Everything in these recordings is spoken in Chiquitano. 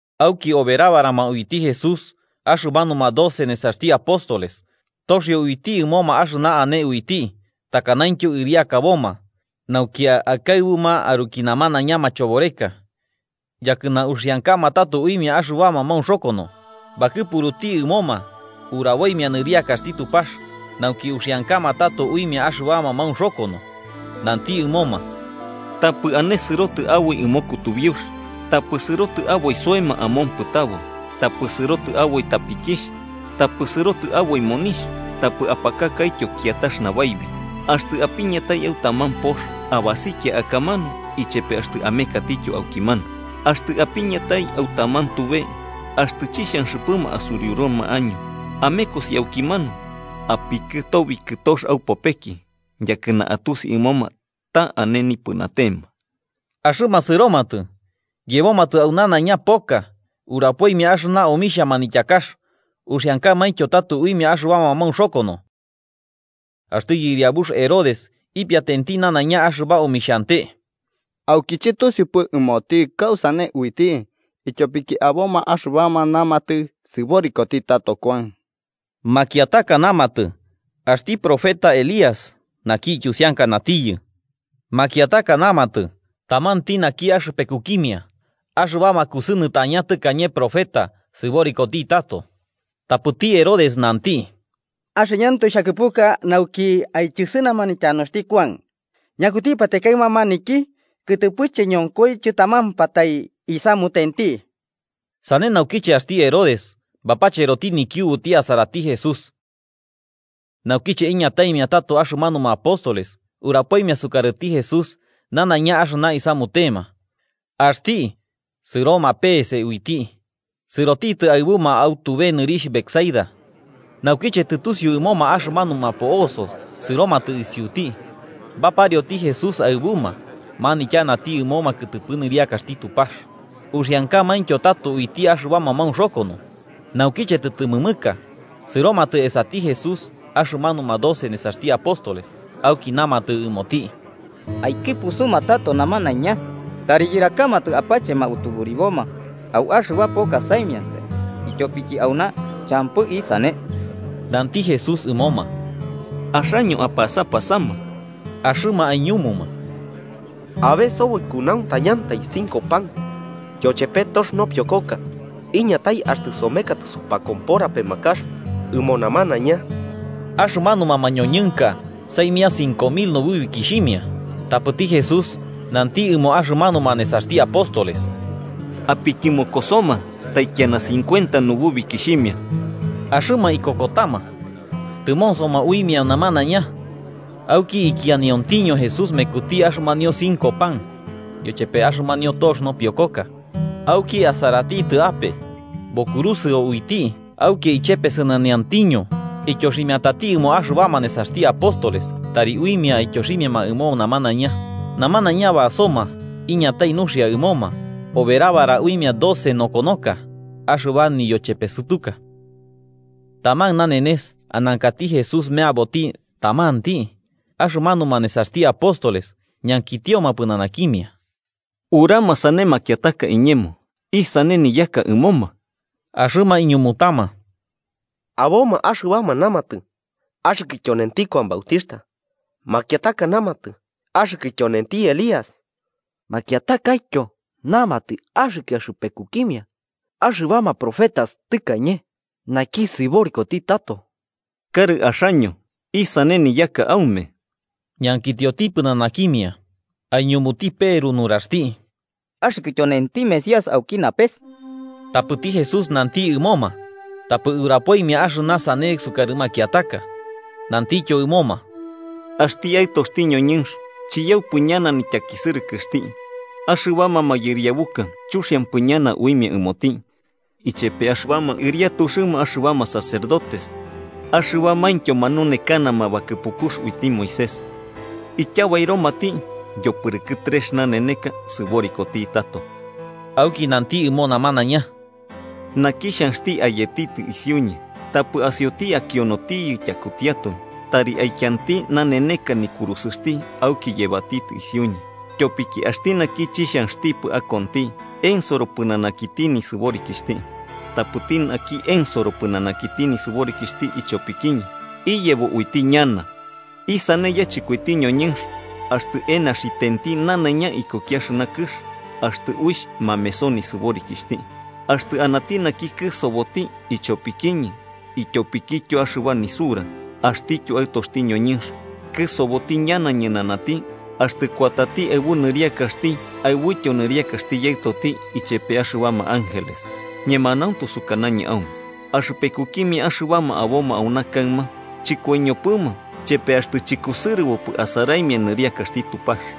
Auki oberabarama uiti Jesús axɨmanuma doce nesaxti apóstoles, toxio uiti ɨmoma axɨna ane uiti takanaintyo ɨriakaboma nauki akaɨbuma aruki namanaiña machoboreka yakɨna uxiankama tato uimia axɨbama maunxokono. Bakɨpuruti ɨmoma uraboimia nɨriakaxti Tupax nauki uxiankama tato uimia axɨbama maunxokono. Nanti ɨmoma: –Tapɨ ane sɨrotɨ aboi ɨmo kutubiux: tapɨ sɨrotɨ aboi soema amompɨtabo, tapɨ sɨrotɨ aboi tapikixh, tapɨ sɨrotɨ aboi monixh, tapɨ apakakaityo kiatax nabaibi. Axtɨ apiñatai au taman pox, abasikia akamanu ichepe axtɨ amekatityo aukimanu. Axtɨ apiñatai au taman tube axtɨ chixhanxɨpɨma asuriuruma año, amekosi aukimanu apikɨtobi kɨtox aupopeki, yakɨna atusi ɨmoma ta ane nipɨnatema. Axɨma sɨromatɨ, yebomatɨ au nanaiña poka, urapoimia axɨba omixhia manityakax uxiankamaintyo tato uimia axɨbama maunxokono. Axti yɨriabux Herodes ipiatenti nanaiña axɨba omixhante. Auki chɨtusiupɨ ɨmoti kausane uiti, ityopiki aboma axɨbama namatɨ sɨborikoti tato Kuan, makiataka namatɨ axti profeta Elías naki ityusiankanatiyɨ, makiataka namatɨ tamanti naki axɨpekukimia axɨbama kusɨnɨtaña tɨkañe profeta, sɨborikoti tato. Tapɨti Herodes nanti: –Axɨñɨantoe xhakɨpuka nauki aityɨsɨnama nityanuxti Kuan. ¿Ñakutipatae kaɨma maniki, kɨtɨpɨche ñonkoi chɨtamampatai isamutenti? Sane naukiche axti Herodes bapacheroti nikiubuti asarati Jesús. Naukiche iñataimia tato axɨmanuma apóstoles, urapoimia sukarɨti Jesús nanaiña axɨna isamutema. Axti, sɨroma pe'ese uiti, sɨrotitɨ aɨbuma au tube nɨrixh Betsaida. Naukiche tɨtusiu ɨmoma axɨmanuma po'oso, sɨromatɨ isiuti. Baparioti Jesús aɨbuma, manityanati ɨmoma kɨtɨpɨ nɨriakaxti Tupax uxiankamaintyo tato uiti axɨbama maunxokono. Naukiche tɨtɨmɨmɨka, sɨromatɨ esati Jesús axɨmanuma doce nesaxti apóstoles auki namatɨ ɨmoti: –Aikɨpusuma tato namanaiña, tari yɨrakamatɨ apachema utuburiboma au axɨba poka saimiantai, ityopiki auna champɨ isane. Nanti Jesús ɨmoma: –Axaño apasapasama. Axɨma aiñumuma: –Abe soboi kunauntañantai cinco pan yochepe tox nopiokoka, iñatai axtɨ somekatɨ supakompora pemakax ɨmo namanaiña. Axɨmanuma mañoñɨnka saimia cinco mil nububikixhimia. Tapɨti Jesús nanti ɨmo axɨmanuma nesaxti apóstoles: –Apityɨmokosoma taikiana cincuenta nububikixhimia. Axɨma ikokotama tɨmonsoma uimia namanaiña. Auki ikianiontiño Jesús mekuti axɨmanio cinco pan yochepe axɨmanio tox nopiokoka auki, asaratitɨ ape, bokurusɨo uiti, auki ichepesɨnaniontiño ityoximiatati ɨmo axɨbama nesaxti apóstoles tari uimia aityoximiama ɨmo namanaiña. Namanaiña basoma iñatai nuxia ɨmoma, oberabara uimia doce nokonoka axɨba niyochepesɨtuka. Taman nanenes anankati Jesús meaboti tamanti, axɨmanuma nesaxti apóstoles, ñankitioti pɨnanakimia: –¿Urama sane makiataka iñemo isane niyaka ɨmoma? Axɨma iñumutama: –Aboma axɨbama namatɨ axɨkɨ tyonenti Kuan Bautixhta, makiataka namatɨ axɨkɨ tyonenti Elías, makiatakaityo namatɨ axɨkɨ axɨpekukimia axɨbama profetas tɨkañe, naki sɨborikoti tato. 20–Karɨ axaño, ¿isane niyaka aume?–ñankitioti pɨnanakimia. Aiñumuti Peru nuraxti: –Axɨkɨ tyonenti Mesías auki napes. Tapɨti Jesús nanti ɨmoma tapɨ urapoimia axɨna sane sukarɨ makiataka. Nantityo ɨmoma: –Axti Aɨtoxti ñoñɨnx chiyaupɨ ñana nityakisɨrɨkɨxti, axɨbama mayɨriabuka chuxiampɨ ñana uimia ɨmoti, ichepe axɨbama ɨriatuxɨma axɨbama sacerdotes axɨbamaintyo manunekanama bakɨpukux uiti Moisés. Ityabairomati, yopɨrɨkɨ trex naneneka sɨborikoti tato. Auki nanti ɨmo namanaiña: –Naki xhanxti ayetitɨ isiuñɨ, tapɨ asioti akionotiyɨ tyakutiatoi, tari aikianti naneneka nikurusɨxti auki yebati isiuñɨ. Tyopiki axti naki chixhanxtipɨ akonti, ensoro pɨnanakiti nisɨborikixhti. Tapɨti naki ensoro pɨnanakiti nisɨborikixhti ichopikiñɨ, iyebo uiti ñana. ¿Isane yachɨkoiti ñoñɨnx axtɨ enaxitenti nanaiña ikuki axɨna kɨx, axtɨ uixh mameso nisɨborikixhti? Axtɨ anati naki kɨsoboti ichopikiñɨ ityopikityo axɨba nisura, axtityo Aɨtoxti ñoñɨnx kɨsoboti ñana ñɨnanati axtɨ kuatati aɨbu nɨriakaxti aɨbuityo nɨriakaxti Yaɨtoti ichepe axɨbama ángeles. Ñemanauntu sukanañɨ aume axɨpekukimia axɨbama aboma auna kaɨma chɨkoiñopɨma chepe axtɨ chɨkusɨrɨbopɨ asaraimia nɨriakaxti Tupax.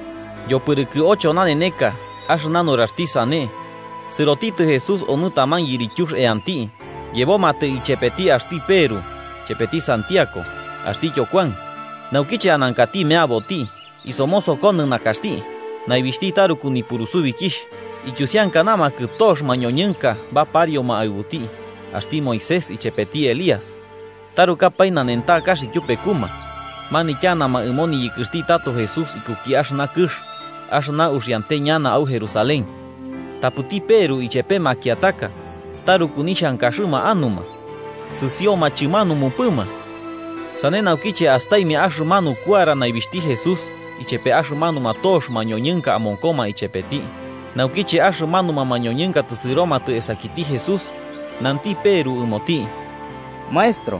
Yopɨrɨkɨ ocho naneneka axɨna nuraxti sane, sɨrotitɨ Jesús onɨ taman yirityux eanti, yebomatɨ ichepeti axti Peru, chepeti Santiago axtityo Kuan. Naukiche anankati meaboti, isomosokonɨ nakaxti, naibixhti taruku nipurusubikixh. Iyusiankanamakɨ tox mañoñɨnka baparioma aɨbuti. Axti Moisés ichepeti Elías, tarukapae nanentakax ityupekuma manityanama ɨmo niyɨkɨxti tato Jesús ikuki axɨna kɨx, axɨna uxiante ñana au Jerusalén. Tapɨti Peru ichepe makiataka taruku nixhankaxɨma anuma, sɨsioma chɨmanumupɨma, sane naukiche astaimia axɨmanu kuara naibixhti Jesús ichepe axɨmanuma tox mañoñɨnka amonkoma ichepeti. Naukiche axɨmanuma mañoñɨnka tɨsɨromatɨ esakiti Jesús, nanti Peru ɨmoti: –Maestro,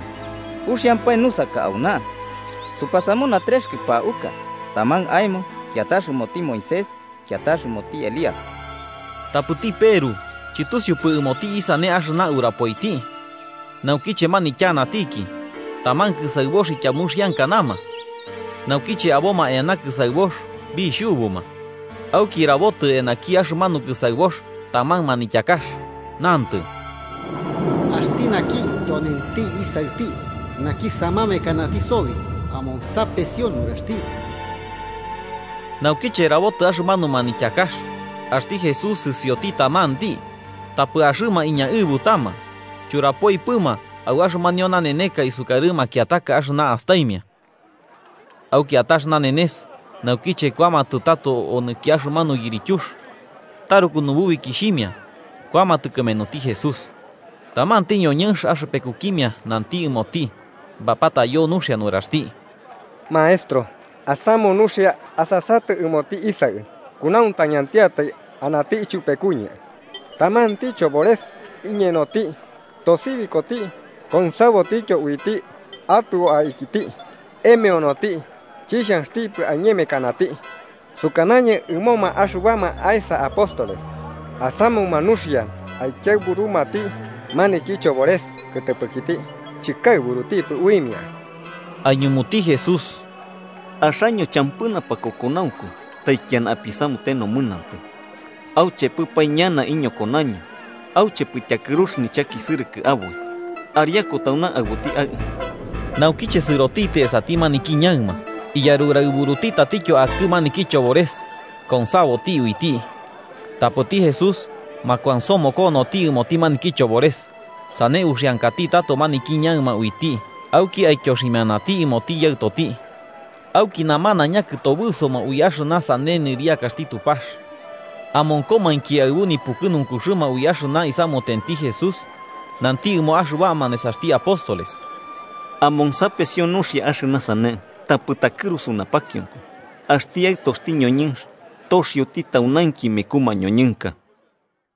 ¡uxiampae nusaka auna! Supasamuna trex kɨpauka: taman aemo, kiatax ɨmoti Moisés kiatax ɨmoti Elías. Tapɨti Peru chɨtusiupɨ ɨmoti isane axɨna urapoiti. Naukiche manityanatiki, taman kɨsaɨbox ityamuxikianama, naukiche aboma eana kɨsaɨbox bixhubuma. Auki rabotɨ eanaki axɨmanu kɨsaɨbox taman manityakax, nantɨ: “Axti naki tyonenti Isaɨti, naki samamekanati sobi: amonsapesio nuraxti.” Naukiche rabotɨ axɨmanu manityakax, axti Jesús sɨsioti tamanti. Tapɨ axɨma iñaɨbutama churapoipɨma au axɨmanio naneneka isukarɨ makiataka axɨna astaimia. Au kiatax nanenes, naukiche kuamatɨ tato onɨki axɨmanu yirityux, taruku nububikixhimia kuamatɨ kɨmenuti Jesús. Tamanti ñoñɨnx axɨpekukimia nanti ɨmoti bapatayo nuxia nuraxti: –Maestro, asamu nuxia, asasatɨ ɨmoti isaɨ, kunauntañantiatai anati ichupekuñɨ. Tamanti chobores iñenoti, tosibikoti konsabotityo uiti atɨo aikiti. Emeonoti chixhanxtipɨ aiñemekanati. Sukanañɨ ɨmoma axɨbama aesa apóstoles asamuma nuxia aikiaɨburumati maniki chobores kɨtɨpɨkiti, chikaɨburutipɨ uimia. Aiñumuti Jesús: –¡Axaño champɨ napakokonaunku taikiana apisamute nomɨnantɨ! ¿Auchepɨpae ñana iñokonaño auchepɨ tyakɨrux nichakisɨrɨkɨ aboi? Ariaku tauna aɨbuti aɨ. Naukiche sɨrotitɨ esati maniki ñaɨma, iyaruraɨburuti tatityo akɨ maniki chobores konsaboti uiti. Tapɨti Jesús makuansomokonoti ɨmoti maniki chobores, sane uxiankati tato maniki ñaɨma uiti auki aityoximianati ɨmoti yaɨtoti. Auki namanaiña kɨtobɨsoma ui axɨna nɨriakaxti Tupax. Amonkomainki aɨbu nipukɨnunkuxɨma ui axɨna isamutenti Jesús, nanti ɨmo axɨbama nesaxti apóstoles: 44–Amonsapesio nuxia axɨna sane tapɨ takɨrusu napakionko: axti Aɨtoxti ñoñɨnx toxioti taunainki meku mañoñɨnka.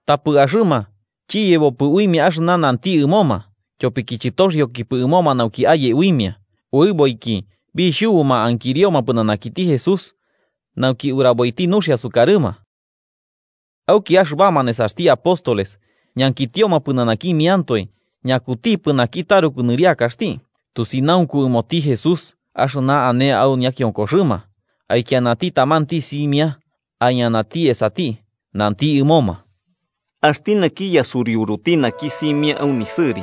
Tapɨ axɨma chiyebopɨ uimia axɨna nanti ɨmoma, tyopiki chɨtoxiokipɨ ɨmoma nauki aye uimia. Uɨboiki bixhubuma ankirioma pɨnanakiti Jesús nauki uraboiti nuxia sukarɨma. Auki axɨbama nesaxti apóstoles ñankitioma pɨnanakimiantoe ñakutipɨ naki taruku nɨriakaxti. Tusinaunku ɨmoti Jesús axɨna ane au ñakionkoxɨma, aikianati tamanti simia, aiñanati esati nanti ɨmoma: –Axti naki yasuriuruti naki simia au nisɨri,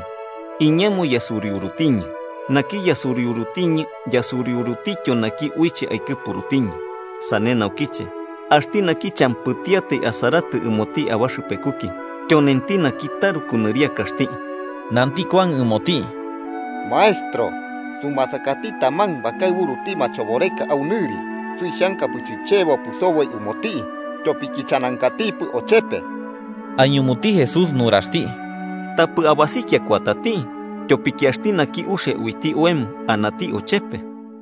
iñemo yasuriurutiñɨ. Naki yasuriurutiñɨ, yasuriurutityo naki uiche aikɨpurutiñɨ. Sane naukiche, axti naki champɨtiatai asaratɨ ɨmoti abaxɨpekuki, tyonenti naki taruku nɨriakaxti. Nanti Kuan ɨmoti: –Maestro, sumasakati taman bakaɨburuti machoboreka au nɨri. Suixhankapɨ chichebopɨ soboi ɨmoti tyopiki chanankatipɨ ochepe. Aiñumuti Jesús nuraxti: –Tapɨ abasikia kuatati, tyopiki axti naki uxia uiti oemo, anati ochepe.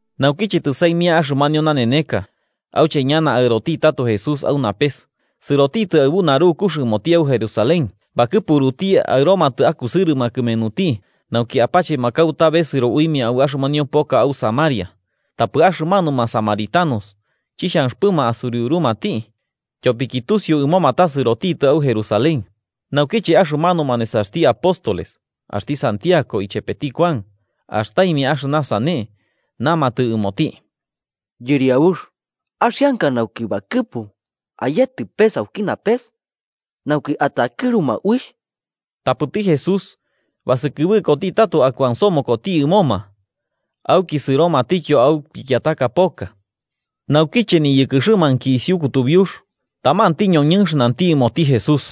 Naukiche tɨsaimia axɨmanio naneneka auche ñana aɨroti tato Jesús au napes, sɨrotitɨ aɨbu narukux ɨmoti au Jerusalén. Bakɨpuruti aɨromatɨ akusɨrɨma kɨmenuti, nauki apachema kauta besɨro uiti au axɨmanio poka au Samaria. Tapɨ axɨmanuma Samaritanos chixhanxɨpɨma asuriurumati, tyopiki tusiu ɨmoma ta sɨrotitɨ au Jerusalén. Naukiche axɨmanuma nesaxti apóstoles axti Santiago ichepeti Kuan astaimia axɨna sane, namatɨ ɨmoti: –Yɨriabux, ¿axianka nauki bakɨpu ayetɨ pes auki napes, nauki atakɨruma uixh? Tapɨti Jesús basɨkɨbɨkoti tato akuansomokoti ɨmoma. Auki sɨromatityo au pikiataka poka. Naukiche niyɨkɨxɨmainki isiu kutubiux, tamanti ñoñɨnx nanti ɨmoti Jesús: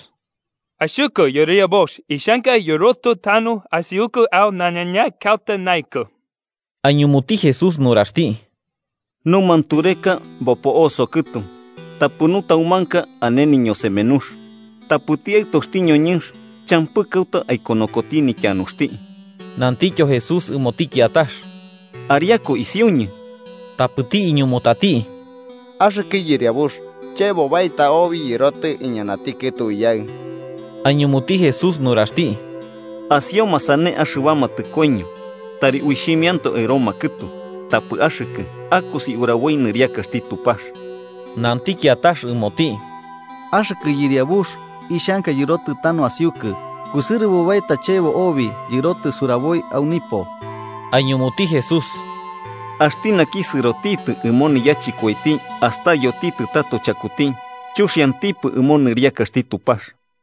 –Axɨkɨ Yɨriabux, ixhanka yɨrotɨ tanu asiukɨ au nanaiña kauta naɨkɨ. Aiñumuti Jesús nuraxti: –Numantureka bopo'oso kɨtu tapɨ nutaumanka ane niñosemenux. Tapɨti Aɨtoxti ñoñɨnx champɨ kauta aikonokoti nityanuxti. Nantityo Jesús ɨmoti kiatax: –Ariaku isiuñɨ. Tapɨti iñumutati: –Axɨkɨ Yɨriabux, chebo baeta obi yɨrotɨ iñanati kɨtu iyaɨ. Aiñumuti Jesús nuraxti: –Asioma sane axɨbama tɨkoiño tari uxhimiantoe aɨroma kɨtu. Tapɨ axɨkɨ akosi uraboi nɨriakaxti Tupax. Nanti kiatax ɨmoti: –Axɨkɨ Yɨriabux, ixhanka yɨrotɨ tanu asiukɨ, kusɨrɨbo baeta chebo obi yɨrotɨ suraboi au nipo. Aiñumuti Jesús: –Axti naki sɨrotitɨ ɨmo niyachɨkoiti astayotitɨ tato chakuti, chuxiantipɨ ɨmo nɨriakaxti Tupax.